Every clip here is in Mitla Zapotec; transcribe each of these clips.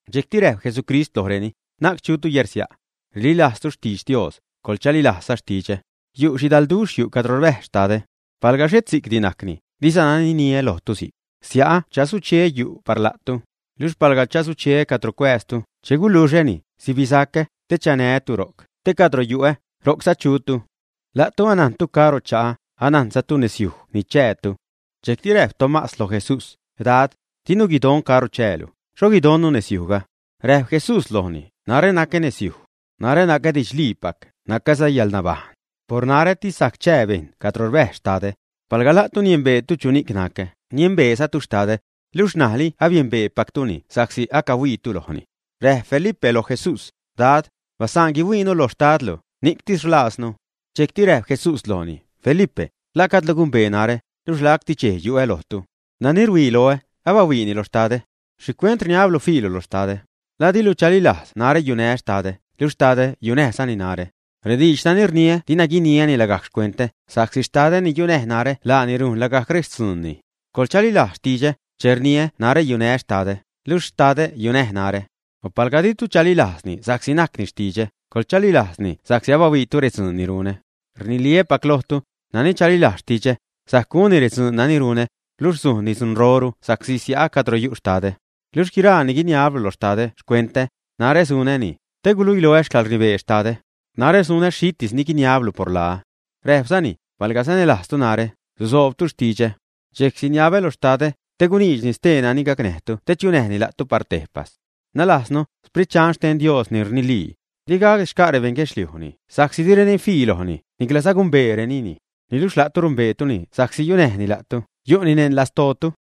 Dxejcti räjp Jesucrist lojreni: ―Na'c chutu yärsia'. Rililajztu xtidx Dios, coḻchalilajzza xtidxä. Yu' xhidalduxh yu' cadro rbäjz Xtadä. Palga xhet si'cdi najcni, dizana niniä lojtu si'c. Sia'ä chasucheä reyu' par la'tu. Luxh palga chasucheä cadro cuääztu, che guluxäni, sibisacä, te chanää́tu ro'c, te cadro yu'ä, ro'cza chutu. La'tu anajntu caro cha'ä, anajnzatu nezyuj ni chäätu. Dxejcti räjp Tomás loj Jesús: ―Dad, dinu guidon caro chäälu, ¿xho guidonnu nezyujga, ä? Räjp Jesús lojni: ―Narä nacä nezyuj. Narä nacä didxliipac, nacäza yäḻnabajṉ. Por narätis sajc chää bejṉ cadro rbäjz Xtadä. Palga la'tu niembeetu chuni'c nacä, niembeezatu Xtadä. Luxh ṉajli abiembeepactuni sa'csi acahuiitu lojni. Räjp Felipe loj Jesús: ―Dad, basaan guihuiinu loj Xtadlu; ni'ctis rlaaznu. Dxejcti räjp Jesús lojni: ―Felipe, ¿la gajdlu gumbee narä, luxh lacti xchej yu'ä lojtu, ä? Nani ruhuii loä, abahuiini lo Xtadä. ¿Xhicuent rniablu fiilu lo Xtadä, ä? ¿La dilu chalilajz najrä yunää́ Xtadä, luxh Xtadä yunäjzani narä, ä? Rediidx nani rniä dina guiniäni lagajc xcuentä, sa'csi Xtadä ni yunäj narä laani rujn lagajc rextzuunni. Coḻchalilajz xtidxä, che rniä narä yunää́ Xtadä, luxh Xtadä yunäj narä. O palga ditu chalilajzni sa'csi najcni xtidxä, coḻchalilajzni sa'csi abahuiitu rextzuun ni runä. Rniliä́pac lojtu, nani chalilajz xtidxä, sajc gunni redzuun nani runä, luxh sujnni dzunroru sa'csi sia'a cadro yu' Xtadä. Luxh guiraa ni guiniablu lo Xtadä xcuentä, narä sunäni, te guluiloä xcäḻrnibee Xtadä. Narä sunä xhitis ni guiniabtu por laä. Räjpzani: ―Palga sanälajztu narä, susoobtu xtidxä. Dxejc siniabä lo Xtadä, te guniidxni stee nani gacnäjtu te chunäjni la'tu par tejpas. Nalajznu, Xprit Dxan xten Dios, ni rnilii. Di gacdi xca' rebeṉ guedxliujni, sa'csi direni fii lojni, niclaza gumbeerenini. Niluxh la'tu numbeetuni sa'csi yunäjni la'tu, yu'ni neṉ lastootu.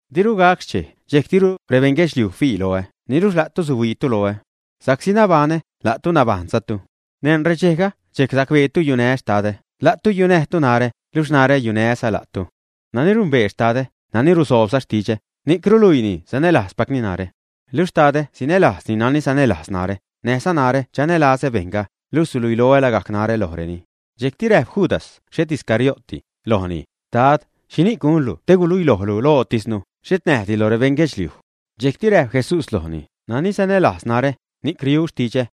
Diru gac xchej, dxejc diru rebeṉ guedxliuj fii loä, niluxh la'tu suhuiitu loä. Sa'csi nabaṉä, la'tu nabajṉzatu. Neṉ redxejga, dxejc sacbeetu yunää́ Xtadä, la'tu yunäjtu narä, luxh narä yunää́za la'tu. Nani numbee Xtadä, nani rusoobza xtidxä, ni'c ruluiini sanälajzpacni narä. Luxh Xtadä sinälajzza nani sanälajz narä, näjza narä chanälazä bejṉga, luxh suluiloä lagajc narä lojreni. Dxejcti räjp Judas (xhet Iscariótedi) lojni: ―Dad, ¿xhini'c gunlu te guluilojlu lojtisnu, xhet näjdi loj rebeṉ guedxluijdi, ä? Dxejcti räjp Jesús lojni: ―Nani sanälajz narä, ni'c riu xtidxä.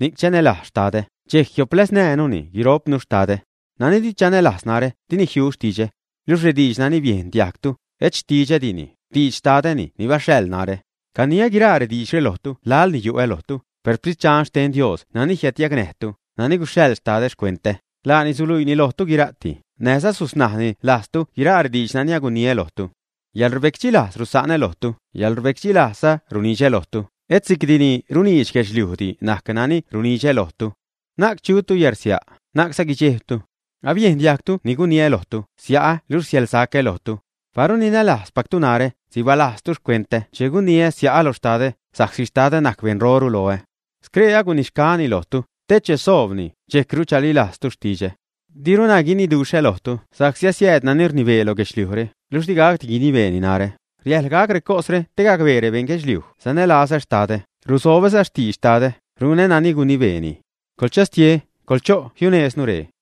Ni'c chanälajz Xtadä, dxejc jiopläznää́nuni guiro'pnu Xtadä. Nani di chanälajz narä, dini jiu xtidxä. Luxh rediidx nani biejn diajgtu, et xtidxädini; xtidx Xtadäni ni baxhaḻ narä. ’Caniä guiraa rediidxre lojtu laḻni yu'ä lojtu, per Sprit Dxan xten Dios nani jiädyacnäjtu, nani guxhaḻ Xtadä xcuentä, laani suluiini lojtu guira'ti, näjza susnajni lajztu guiraa rediidx nani aguniä lojtu. Yäḻrbecdxilajz rusa'nä lojtu, xcäḻrbecdxilazä runidxä lojtu, et si'cdini runiidx guedxliujdi najc nani runidxä lojtu. Na'c chutu yärsia', na'cza guidxejbtu. Abiejn diajgtu ni guniä lojtu: Sia'ä luxh siälsacä lojtu. Paru ninälajzpactu narä, sibalajztu xcuentä che guniä sia'ä lo Xtadä, sa'csi Xtadä najc beṉroru loä. Scree agunixgaäni lojtu, te che soobni, dxejcru chalilajztu xtidxä. ’Diruna guiniduxhä lojtu, sa'csi asiääd nani rnibee loj guedxliujre, luxh digacdi guinibeeni narä; riäjḻ gac recosre te gacbee rebeṉ guedxliuj sanälazä Xtadä, rusobäza xtidx Xtadä, runä nani gunibeeni. Coḻchastie, coḻcho' jiunejznu ree.